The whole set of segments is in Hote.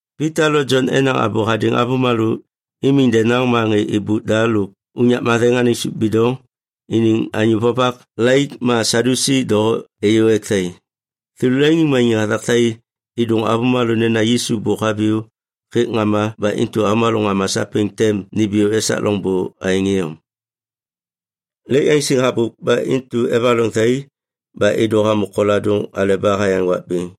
Pita lo Jon enaŋ abô hadêŋ avômalô imiŋ denaŋ, ma ŋê êbôk da lôk unyak matheŋ anêŋ sôp bidoŋ iniŋ anyô vovak laik ma Sadyusi doho êyô ek thai. Thêlô leŋiŋmaniŋ hathak thai êdôŋ avômalô nena Yisu bôk haviyô hêk ŋama ba intu avômalô ŋama sapêŋ tem nimbiyô esak loŋbô aêŋ iyom. Lêk yaŋsiŋ habôk ba intu evaloŋ thai ba êdô hamô koladôŋ aleba hayaŋ wak bêŋ.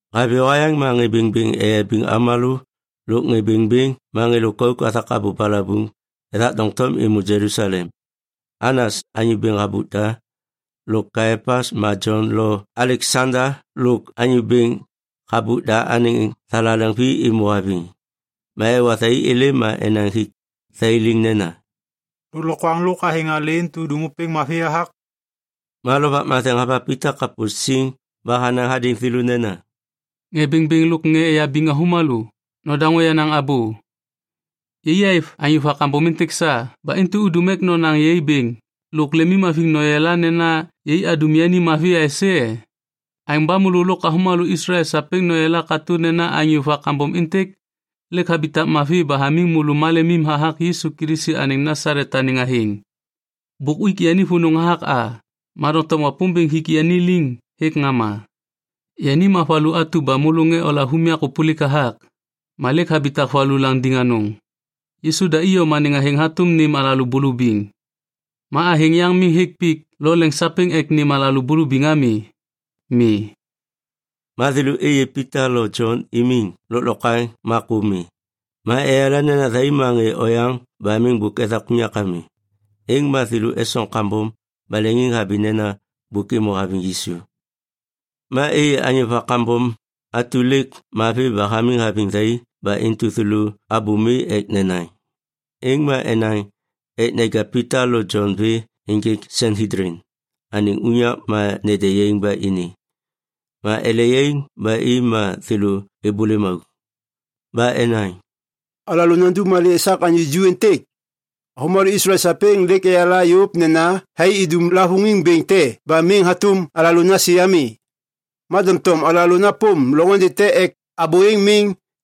Haviyô hayaŋ ma ŋê bêŋbêŋ eyabiŋ avômalô lôk ŋê bêŋbêŋ ma ŋê lôkauk hathak abô balabuŋ ethak doŋtom êmô Jelusalem. Anas, anyô bêŋ habôk da, lôk Kaiapas ma Jon lo Aleksanda lôk anyô bêŋ habôk da anêŋ thalaleŋ vi êmô haviŋ. Ma ewa thai êlêm ma enaŋ hik thai liŋ nena, “Lôklokwaŋ lôk athêŋ alê intu udum ôpêŋ mavi hathak?” Ma Lovak Matheŋ hava Pita kapô siŋ ba hanaŋ hadêŋ thêlô nena, “Ŋê bêŋbêŋ lôk ŋê eyabiŋ avômalô, nodaŋô yenaŋ abô! Yai êv anyô va kambom êntêk sa ba intu udum ek nonaŋ yai bêŋ lôk lemimhaviŋ noyala nena yai adum yani mavi aisê e? Aêŋ ba môlô lôk avômalô Islael sapêŋ noyala katô nena anyô va kambom êntêk lêk habitak mavi ba hamiŋ môlô malemim hathak Yisu Kilisi anêŋ Nasalet anêŋ athêŋ. Bôk uik yani vônô hathak a, ma doŋtom Wapômbêŋ hik yani liŋ hêk ŋama. Yani ma “‘valu atu ba môlô ŋê olav unyak ôpôlik hathak, ma lêk habitak valu landiŋ anôŋ.’ Yisu da iyom anêŋ athêŋ hatôm nêm alalô bulubiŋ. Ma athêŋ yaŋ miŋ hêk pik lo leŋ sapêŋ ek nêm alalô bulubiŋ ami. Mi.” Ma thêlô êyê Pita lo Jon imiŋ lôklokwaŋ ma kô mi, ma eyala nena thai ma ŋê oyaŋ ba miŋ bôk ethak unyak ami. Êŋ ma thêlô esoŋ kambom ba leŋiŋhabi nena bôk êmô haviŋ Yisu. Ma êyê anyô va kambom atu lêk mavi ba hamiŋ haviŋ thai ba intu thêlô abô mi ek nenaŋ. Êŋ ma enaŋ ek neja Pita lo Jon vê ênjêk Sanhedlin anêŋ unyak ma nede yaiŋ ba ini. Ma ele yaiŋ ba i ma thêlô êbôlêm auk. Ba enaŋ, “Alalô nandum malê esak anyô ju êntêk? Avômalô Jelusalem sapêŋ lêk eyala yôv nena thai idum lavôŋiŋ bêŋ te ba miŋ hatôm alalô nasi ami. Ma doŋtom alalô napôm loŋôndê te ek abô êŋ miŋ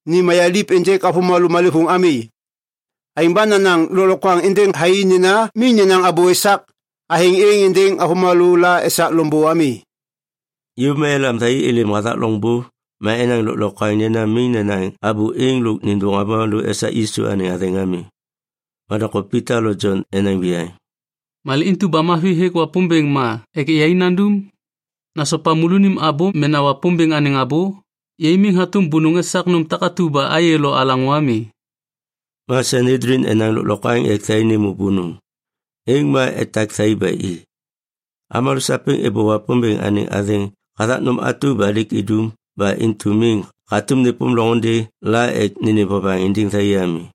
ni mayaliv ênjêk avômalô malêvôŋ ami. Aêŋ ba nanaŋ lôklokwaŋ êndêŋ thai nena miŋ nenaŋ abô esak athêŋ êŋ êndêŋ avômalô la esak loŋbô ami.” Yôv ma elam thai êlêm hathak loŋbô ma enaŋ lôklokwaŋ nena miŋ nenaŋ abô êŋ lôk nêndôŋ avômalô esak Yisu anêŋ athêŋ ami. Ma doŋtom Pita lo Jon enaŋ viyaŋ, “Malê intu ba mavi hêk Wapômbêŋ ma ek yai nandum? Nasopa môlônim abô mena Wapômbêŋ anêŋ abô? Yai miŋ hatôm bônôŋ esak nôm takatu ba ayê lo alaŋô ami.” Ma Sanhedlin enaŋ lôklokwaŋ ek thai nêmô bônôŋ, êŋ ma etak thai ba i. Avômalô sapêŋ êbô Wapômbêŋ anêŋ athêŋ hathak nôm atu ba lêk idum ba intu miŋ hatôm nêpôm loŋôndê la ek nênêm vovaŋ êndêŋ thai ami.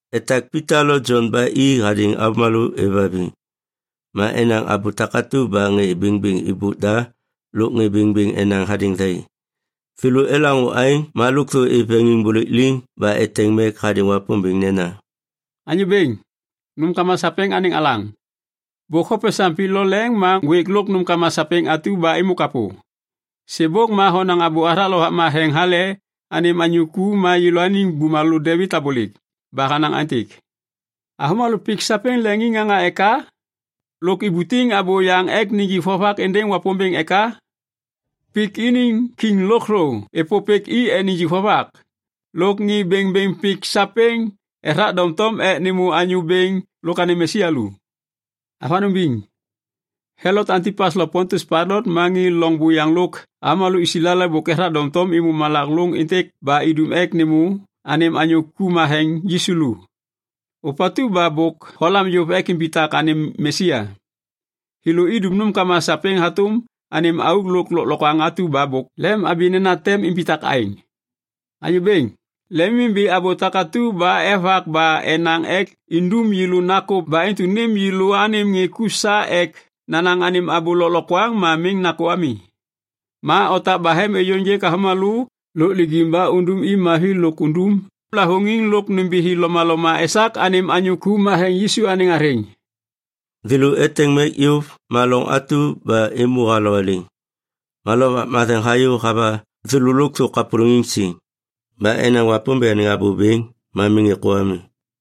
Etak Pita lo Jon ba i hadêŋ avômalô êvhaviŋ. Ma enaŋ abô takatu ba ŋê bêŋbêŋ êbôk da lôk ŋê bêŋbêŋ enaŋ hadêŋ thai. Thêlô elaŋô aêŋ ma lôkthô êv veŋiŋbôlêk liŋ ba eteŋ mek hadêŋ Wapômbêŋ nena, “Anyô Bêŋ, nômkama sapêŋ anêŋ alaŋ, bôk hopesaŋ pik lo leŋ ma ŋgwêk lôk nômkama sapêŋ atu ba êmô kapô. Sêbôk ma honaŋ abô hathak Lovak Matheŋ hale anêm anyô ku ma yêlôaniŋ bumalô Devit abôlêk. Ba hanaŋ aêntêk, “‘Avômalô pik sapêŋ leŋiŋŋaŋa eka? Lôk ibutiŋ abôyaŋ ek nijik vovak êndêŋ Wapômbêŋ eka? Pik iniŋ kiŋ lôkthô êpôpêk i ek nijik vovak. Lôk ŋê bêŋbêŋ pik sapêŋ ethak doŋtom ek nêmô Anyô Bêŋ lôk anêŋ Mesia lu.’ Avanôŋ biŋ, Helot Antipas lo Pontius Pailat ma ŋê loŋ buyaŋ lôk avômalô Islael bôk ethak doŋtom êmô malak lôŋ êntêk ba idum ek nêmô anêm anyô ku matheŋ Yisu lu, ôpatu ba bôk holam yôv ek imbitak anêm Mesia. Thêlô idum nômkama sapêŋ hatôm anêm auk lôk lôklokwaŋ atu ba bôk lemhabi nena tem imbitak aêŋ. Anyô Bêŋ, lemimbi abô takatu ba evak ba enaŋ ek indum yêlô nakô ba intu nêm yêlô anêm ŋê ku sa ek nanaŋ anêm abô lôklokwaŋ ma miŋ nakô ami. Ma otak bahem êyôŋgêk avômalô lôk lijiŋ ba undum i mavi lôk undum lavôŋiŋ lôk nômbithi lomaloma esak anêm anyô ku matheŋ Yisu anêŋ athêŋ.” Thêlô eteŋ mek yôv ma loŋ atu ba êmô halowaliŋ. Ma Lovak Matheŋ hayô hava thêlô lôkthô kapôlôŋiŋ siŋ. Ba enaŋ Wapômbêŋ anêŋ abô bêŋ ma miŋ êkô ami.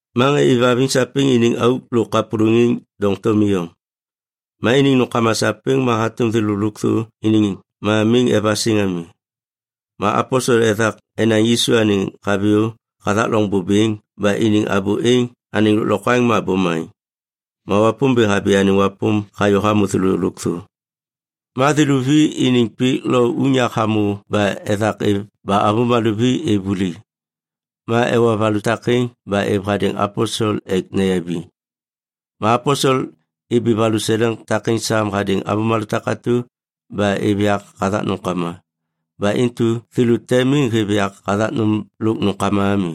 Ma ŋê êvhaviŋ sapêŋ iniŋ auk lôk kapôlôŋiŋ doŋtom iyom. Ma iniŋ nômkama sapêŋ ma hatôm thêlô lôkthô iniŋ ma miŋ evasiŋ ami. Ma aposel ethak enaŋ Yisu anêŋ haviyô hathak loŋbô bêŋ ba iniŋ abô êŋ anêŋ lôklokwaŋ ma bomaŋ. Ma Wapômbêŋ habi anêŋ wapôm hayô hamô thêlô lôkthô. Ma thêlô vi iniŋ pik lo unyak hamô ba ethak êv ba avômalô vi êv vuli. Ma ewa valu takêŋ ba êv hadêŋ aposel ek neyabiŋ. Ma aposel ibi valuseleŋ takêŋ sam hadêŋ avômalô takatu ba êv yak hathak nômkama. Ba intu thêlô te miŋ hêv yak hathak nôm lôk nômkama ami.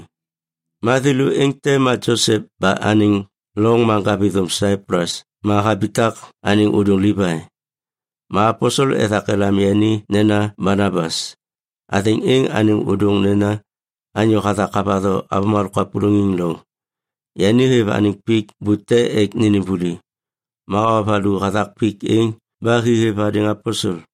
Ma thêlô êŋ te ma Josep ba anêŋ loŋ ma ŋgavithôm Saiplus ma habitak anêŋ ôdôŋ Livai. Ma aposel ethak elam yani nena Banabas, athêŋ êŋ anêŋ ôdôŋ nena, “Anyô hathak havatho avômalô kapôlôŋiŋ loŋ.” Yani hêv anêŋ pik bute ek nênêm vuli. Ma hawa valu hathak pik êŋ ba hi hêv hadêŋ aposel.